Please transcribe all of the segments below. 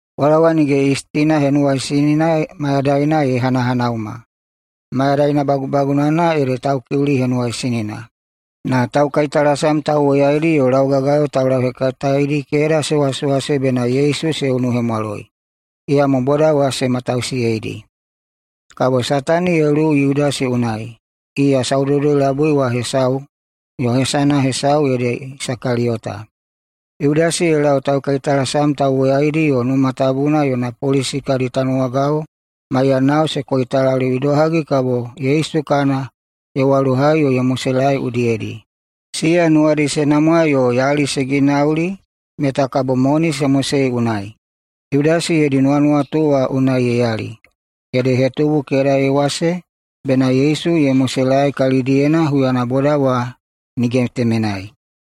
Pwalawa Nige Yistina Henuwaisinina mayadaina ye hanahanauma, mayadaina bagubagunana ede Taukiuli Henuwaisinina. Na taukaitalasam tauwoyaidi yo laugagayo taulauhekataedi keda se wasewase bena Yesu se unuhemwaloi. Iyamo boda wa se matausiyeidi. Kabo Satani ye luwu Yudasi unai. Iya saudoudoi-labui wa hesau, yo hesana hesau ede Isakaliyota. Yudasi ye lau taukaitalasam tauwoyaidi yo Numa Tabuna yona polisi kadi tanuwagao maiyanao se koitalaliu idohagi kabo Yesu kana ye walohai yo ye moselaei udiyedi. Siya nuwadi se namwa yo yali se ginauli meta kabo moni se mosei unai. Yudasi yodi nuwanuwatu wa unai ye yali, ede ye hetubu keda ye wase bena Yesu ye moselaei kalidiyena huyana boda wa nige temenai.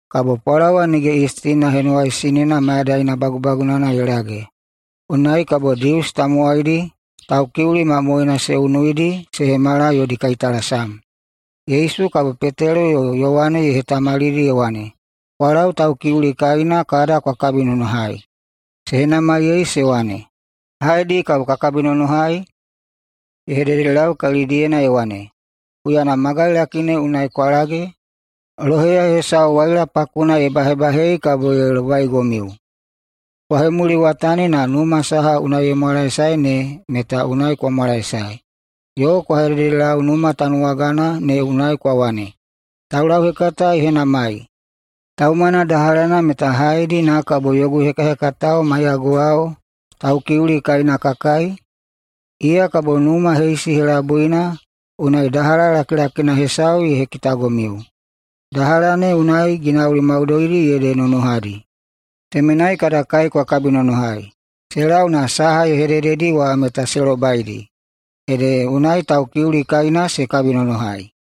Kabo Pwalawa Nige Yistina Henuwaisinina mayadaina bagubagunana ye lage, unai kabo Dius tamowaidi Taukiuli mamoena se unuidi se hemala yodi kaitalasam. Yesu kabo Petelo yo Yowane ye hetamalidi ye wane, “Kwa lau Taukiuli kaina kada kwa kabinonohai.” Se henamaiyei se wane, “Haedi kabo ka kabinonohai?” Ye hededelau kalidiyena ye wane, “Huyana magailaki ne unai kwa lage, loheya hesau waila pakuna ye bahebahei kabo ye lobaigomiu. Kwa hemuliwatani na numa saha unai ye mwalaesae ne meta unai kwa mwalaesae yo kwa hededelau numa tanuwagana ne unai kwa wane, ‘Taulauhekata ye henamai: Taumana dahalana meta haedi na kabo yogu hekahekatao maiyaguwao Taukiuli kaina ka kai?’ Iya kabo numa heisi helabuina unai dahala lakilakina hesau ye hekitagomiu. Dahala ne unai ginauli maudoidi ede nonohadi. Temenai kada kai kwa kabinonohai.” Se lau na saha ye hedededi wa meta se lobaidi. Ede unai Taukiuli kaina se kabinonohai.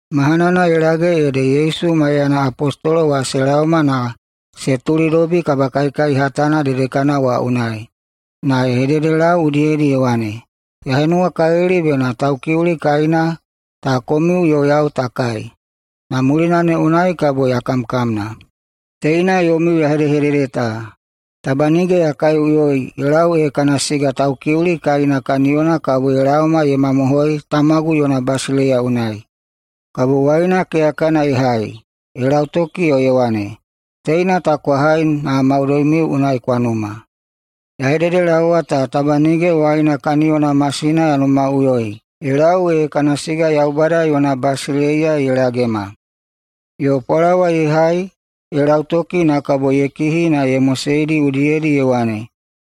Mahanana ye lage ede Yesu maiyana apostolo wa se laoma na se tulidobi kabakaikai hatana dedekana wa unai. Na ye hededelau udiyedi ye wane, “Ya henuwakalili bena Taukiuli kaina ta komiu yo yau ta kai, na mulina ne unai kabo ya kamkamna. Teina yomiu ya hedehedede ta: Taba nige ya kaiꞌuyoi ye lau ee kana siga Taukiuli kaina kaniyona kabo ye laoma ye mamohoi Tamagu yona basileiya unai.” Kabo waina keyakana ye hai, ye lautoki yo ye wane, “Teina ta kwa hai na maudoimiu unai kwa numa. Ya hededelaowa ta taba nige wine kaniyona masina ya numaꞌuyoi, ye lau ee kana siga Yaubada yona basileiya ye lagema.” Yo pwalawa ye hai ye lautoki na kabo ye kihi na ye moseidi udiyedi na ye wane,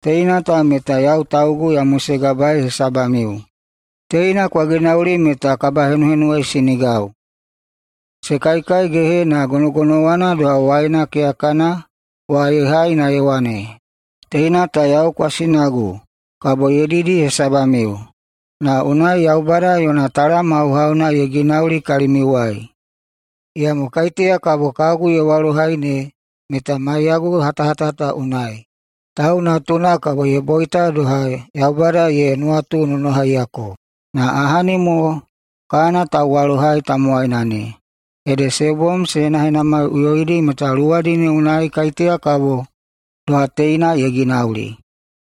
“Teina ta meta yau taugu ya mosegabaei hesabamiu. Teina kwa ginauli meta kabahenuhenuwaisinigau.” Se kaikaigehe, na gonogonowana doha, waina keyakana wa ye hai na ye wane, “Teina ta yau kwasinagu kabo ye didi hesabamiu, na unai kabo Yaubada yona talam hauhauna ye ginauli kalimiuwai. Iyamo kaiteya kabo kagu ye walohai ne meta maiyagu hatahata ta unai. Tau Natuna kabo ye boita doha Yaubada ye nuwatunonohaiyako, na ahani mo kana tauwalohai tamowaina ne!” Ede se bom se henahenamaiꞌuyoidi meta luwadi ne unai kaiteya kabo doha teina ye ginauli.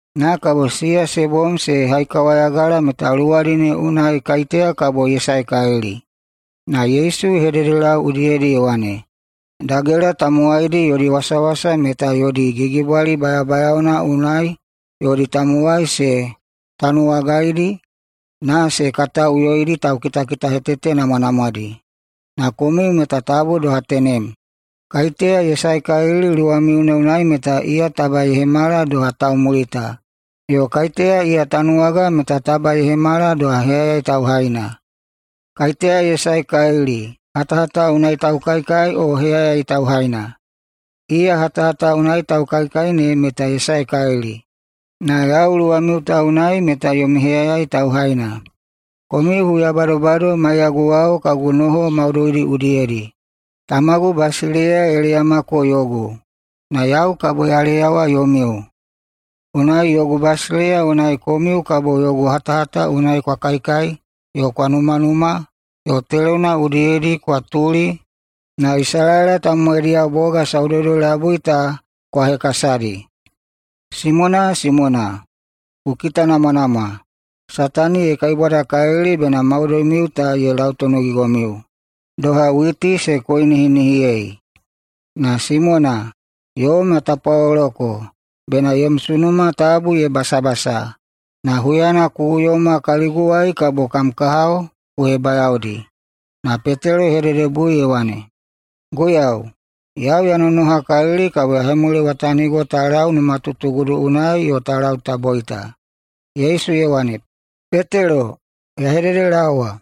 Na kabo siya se bom se haikawayagala meta luwadi ne unai kaiteya kabo ye saekalili. Na Yesu ye hededelau udiyedi ye wane, “Dagela tamowaidi yodi wasawasa meta yodi gigibwali bayabayaona unai yodi tamowai se tanuwagaidi, na se kataiꞌuyoidi taukitahetete namwanamwadi. Na komiu meta tabu doha tenem. Kaiteya ye saekalili luwamiu ne unai meta iya taba ye hemala doha taumulita, yo kaiteya iya tanuwaga meta taba ye hemala doha heyayai tauhaina. Kaiteya ye saekalili, hatahata unai taukaikai, o heyayai tauhaina? Iya hatahata unai taukaikai ne meta ye saekalili. Na yau luwamiu ta unai meta yomi heyayai tauhaina. Komiu huya badobado maiyaguwao kagu noho maudoidi udiyedi. Tamagu basileiya ye leyamako yogu, na yau kabo ya leyawa yomiu, unai yogu basileiya unai komiu kabo yogu hatahata unai kwa kaikai yo kwa numanuma yo telona udiyedi kwa tuli na Isalaela tamowaidiyao boga saudoudoi-labui ta kwa hekasadi. Simona, Simona, ku kitanamwanamwa! Satani ye kaibwadakalili bena maudoimiu ta ye lautonogigomiu doha witi se koinihinihiyei. Na Simona, yom ya tapwaloloko bena yom sunuma tabu ye basabasa. Na huyana ku uyoma kaliguwai kabo kam kahao ku hebayaodi.” Na Petelo ye hededebui ye wane, “Guiyau, yau ya nonohakalili kabo ya hemuliwatanigo ta lau numatutugudu unai yo ta lau ta boita.” Yesu ye wane, “Petelo, ya hededelaowa: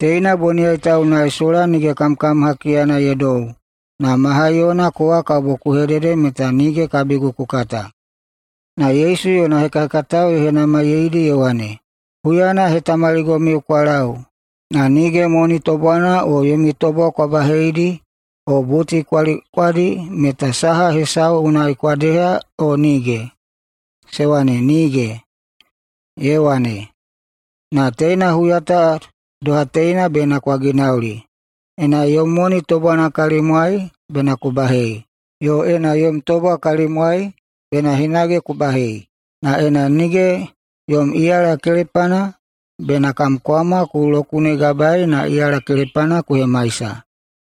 Teina boniyai ta unai sola nige kamkam hakiyana ye dou, na ma haiyona kowa kabo ku hedede meta nige kabigu ku kata.” Na Yesu yona hekahekatao ye henamaiyeidi ye wane, “Huyana ya hetamaligomiu kwa lau, na nige moni tobwana o yomi tobwa kwa baheidi o buti kwa likwadi meta saha hesau unai kwa deha o nige?” Se wane, “Nige!” Ye wane, “Na teina huya ta doha teina bena kwa ginauli: Ena yom moni tobwana kalimwai, bena ku bahei, yo ena yom tobwa kalimwai, bena hinage ku bahei. Na ena nige yom iyala kelepana, bena kam kwama ku lokunegabaei na iyala kelepana ku hemaisa.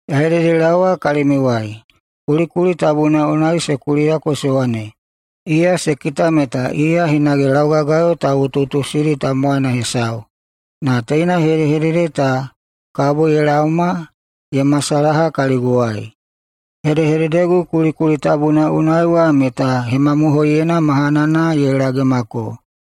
Ya hededelaowa kalimiuwai: Kulikuli tabuna unai se kuliyako se wane, ‘Iya se kita meta iya hinage laugagayo tauꞌutuꞌutusidi tamowaina hesau,’ na teina hedehedede ta kabo ye laoma ye masalaha kaliguwai. Hedehededegu kulikuli tabuna unai wa meta hemamohoiyeina mahanana ye lagemako.”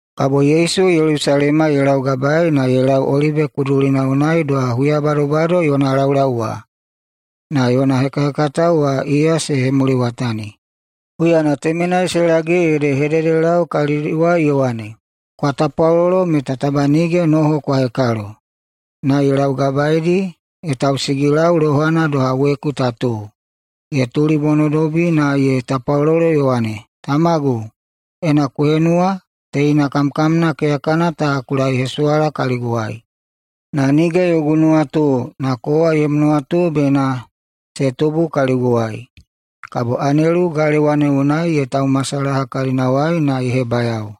Kabo Yesu Yelusalema ye laugabaei na ye lau Olibe Kudulina unai doha huya badobado yona laulau wa, na yona hekahekatao wa iya se hemuliwatani. Huyana temenai se lage ede ye hededelau kalidiwai ye wane, “Kwa tapwalolo meta taba nige noho kwa hekalo.” Na ye laugabaeidi ye tausigilau lohana doha weku ta tuu, ye tulibonodobi na ye tapwalolo ye wane, “Tamagu, ena ku henuwa, teina kamkamna keyakana ta ku laehesuwala kaliguwai. Na nige yogu nuwatu, na kowa yom nuwatu bena se tubu kaliguwai.” Kabo anelu galewa ne unai ye taumasalaha kalinawai na ye hebayao.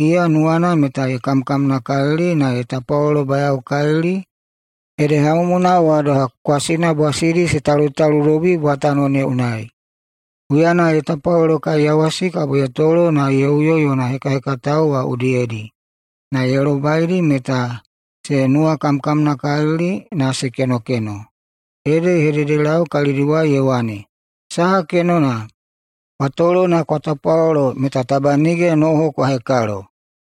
Iya nuwana meta ye kamkamnakalili na ye tapwalolobayaokalili, ede hamumuna wa doha kwasina bwasidi se talutaludobi bwatano ne unai. Huyana ye tapwalolokaiyawasi kabo ye tolo na ye uyo yona hekahekatao wa udiyedi, na ye lobaidi meta se nuwakamkamnakalili na se kenokeno. Ede ye hededelau kalidiwai ye wane, “Saha kenona? Kwa tolo na kwa tapwalolo meta taba nige noho kwa hekalo.”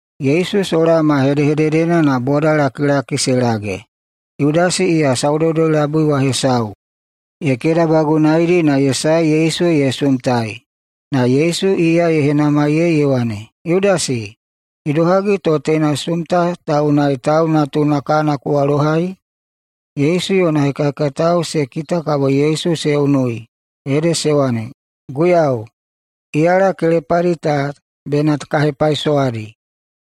Yesu sola ma hedehededena na bodalakilaki se lage. Yudasi, iya saudoudoi-labui wa hesau, ye kedabagunaidi na ye sae Yesu ye sumtai. Na Yesu iya ye henamaiyei ye wane, “Yudasi, idohagi to teina sumta ta unai Tau Natuna kana ku walohai?” Yesu yona hekahekatao se kita kabo Yesu se unui, ede se wane, “Guiyau, iyala kelepadi ta bena ka hepaisowadi?”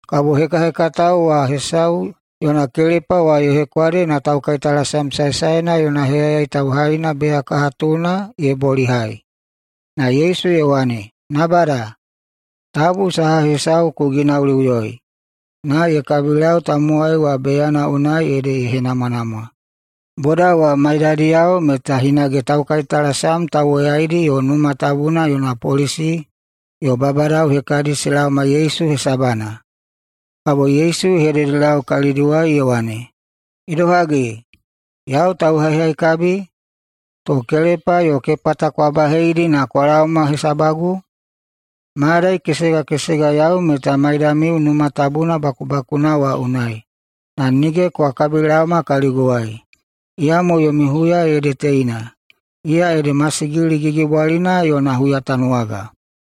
Kabo hekahekatao wa hesau yona kelepa wa ye hekwade na taukaitalasam saesaena yona heyayai tauhaina beyakahatuna ye bolihai. Na Yesu ye wane, “Nabada! Tabu saha hesau ku ginauliꞌuyoi!” Na ye kabilau tamowai wa beyana unai ede ye henamwanamwa. Boda wa maidadiyao meta hinage taukaitalasam tauwoyaidi yo Numa Tabuna yona polisi yo babadao hekadi se laoma Yesu hesabana. Kabo Yesu ye hededelau kalidiwai ye wane, “Idohagi, yau tauhaihaikabi, to kelepa yo kepata kwa baheidi na kwa laoma hesabagu? Mayadai kesegakesega yau meta maidamiu Numa Tabuna bakubakuna wa unai, na nige kwa kabilaoma kaliguwai. Iyamo yomi huya ede teina. Iya ede masigili gigibwalina yona huyatanuwaga.”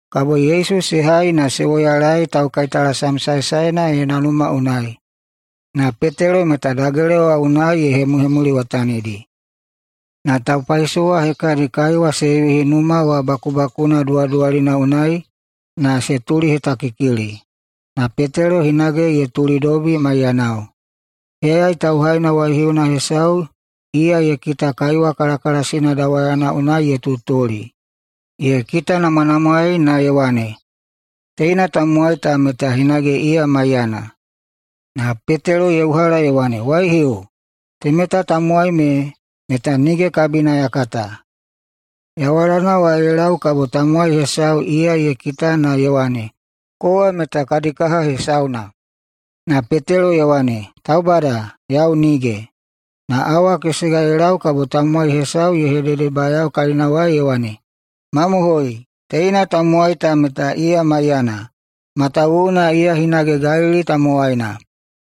Kabo Yesu se hai na se woyalaei taukaitalasam saesaena yona numa unai. Na Petelo meta dagela wa unai ye hemuhemuliwatanidi. Na [taupaisowa hekadi] kaiwa se yuhi numa wa bakubakuna duwaduwalina unai na se tulihetakikili, na Petelo hinage ye tulidobi maiyanao. Heyayai tauhaina waihiuna hesau iya ye kita kaiwa kalakalasina dawayana unai ye tutuli. Ye kitanamwanamwaei na ye wane, “Teina tamowai ta meta hinage iya maiyana.” Na Petelo ye uhala ye wane, “Waihiu, temeta tamowai me meta nige kabina ya kata.” Yawalana wa ye lau kabo tamowai hesau iya ye kita na ye wane, “Kowa meta kadi kaha hesauna.” Na Petelo ye wane, “Taubada, yau nige!” Na awa kesega ye lau kabo tamowai hesau ye hededebayao kalinawai ye wane, “Mamohoi, teina tamowai ta meta iya maiyana, matawuwuna iya hinage Galili tamowaina.”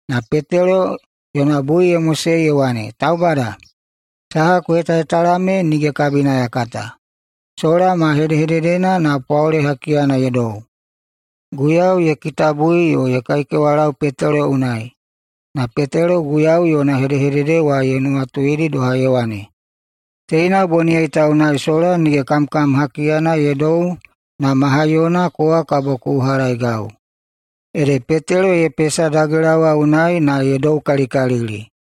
Na Petelo yona bui ye mosei ye wane, “Taubada, saha ku hetahetala me nige kabina ya kata!” Sola ma hedehededena na pwaole hakiyana ye dou. Guiyau ye kitabui yo ye kaikewalau Petelo unai, na Petelo Guiyau yona hedehedede wa ye nuwatuidi doha ye wane, “Teina boniyai ta unai sola nige kamkam hakiyana ye dou na ma haiyona kowa kabo ku uhalaeigau.” Ede Petelo ye pesa dagela wa unai na ye doukalikalili.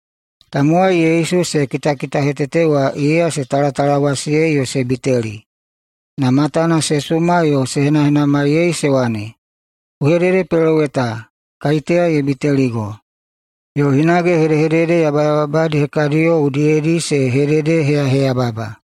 Tamowai Yesu se kitakitahetete wa iya se talatalawasiyei yo se biteli. Na matana se suma yo se henahenamaiyei se wane, “Ku hededepeloweta! Kaiteya ye biteligo?” Yo hinage hedehedede yabayababadi hekadiyo udiyedi se hededeheyaheyababa.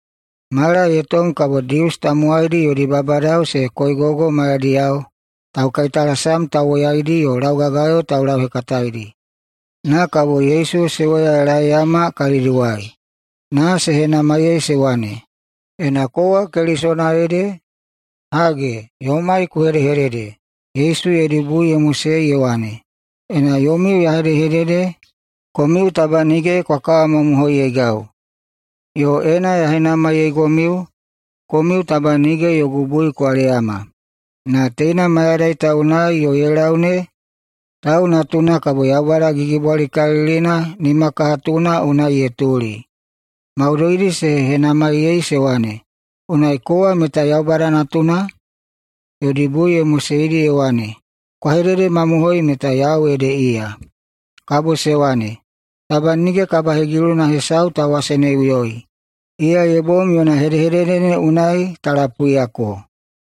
Mala ye tom kabo Dius tamowaidi yodi babadao se koigogo maiyadiyao taukaitalasam tauwoyaidi yo laugagayo taulauhekataedi. Na kabo Yesu se woyalaeiyama kalidiwai. Na se henamaiyei se wane, “Ena kowa Kelisona ede, hage, yomai ku hedehedede.” Yesu yodi bui ye moseidi ye wane, “Ena yomiu ya hedehedede, komiu taba nige kwa kawamamohoiyeigau, yo ena ya henamaiyeigomiu, komiu taba nige yogu bui kwa leyama. Na teina mayadai ta unai yo ye lau ne, Tau Natuna kabo Yaubada Gigibwalikalilina nimakahatuna unai ye tuli.” Maudoidi se henamaiyei se wane, “Unai kowa meta Yaubada Natuna?” Yodi bui ye moseidi ye wane, “Kwa hededemamohoi meta yau ede iya.” Kabo se wane, “Taba nige kabahegiluna hesau ta waseneiꞌuyoi. Iya ye bom yona hedehedede ne unai ta lapuiyako.”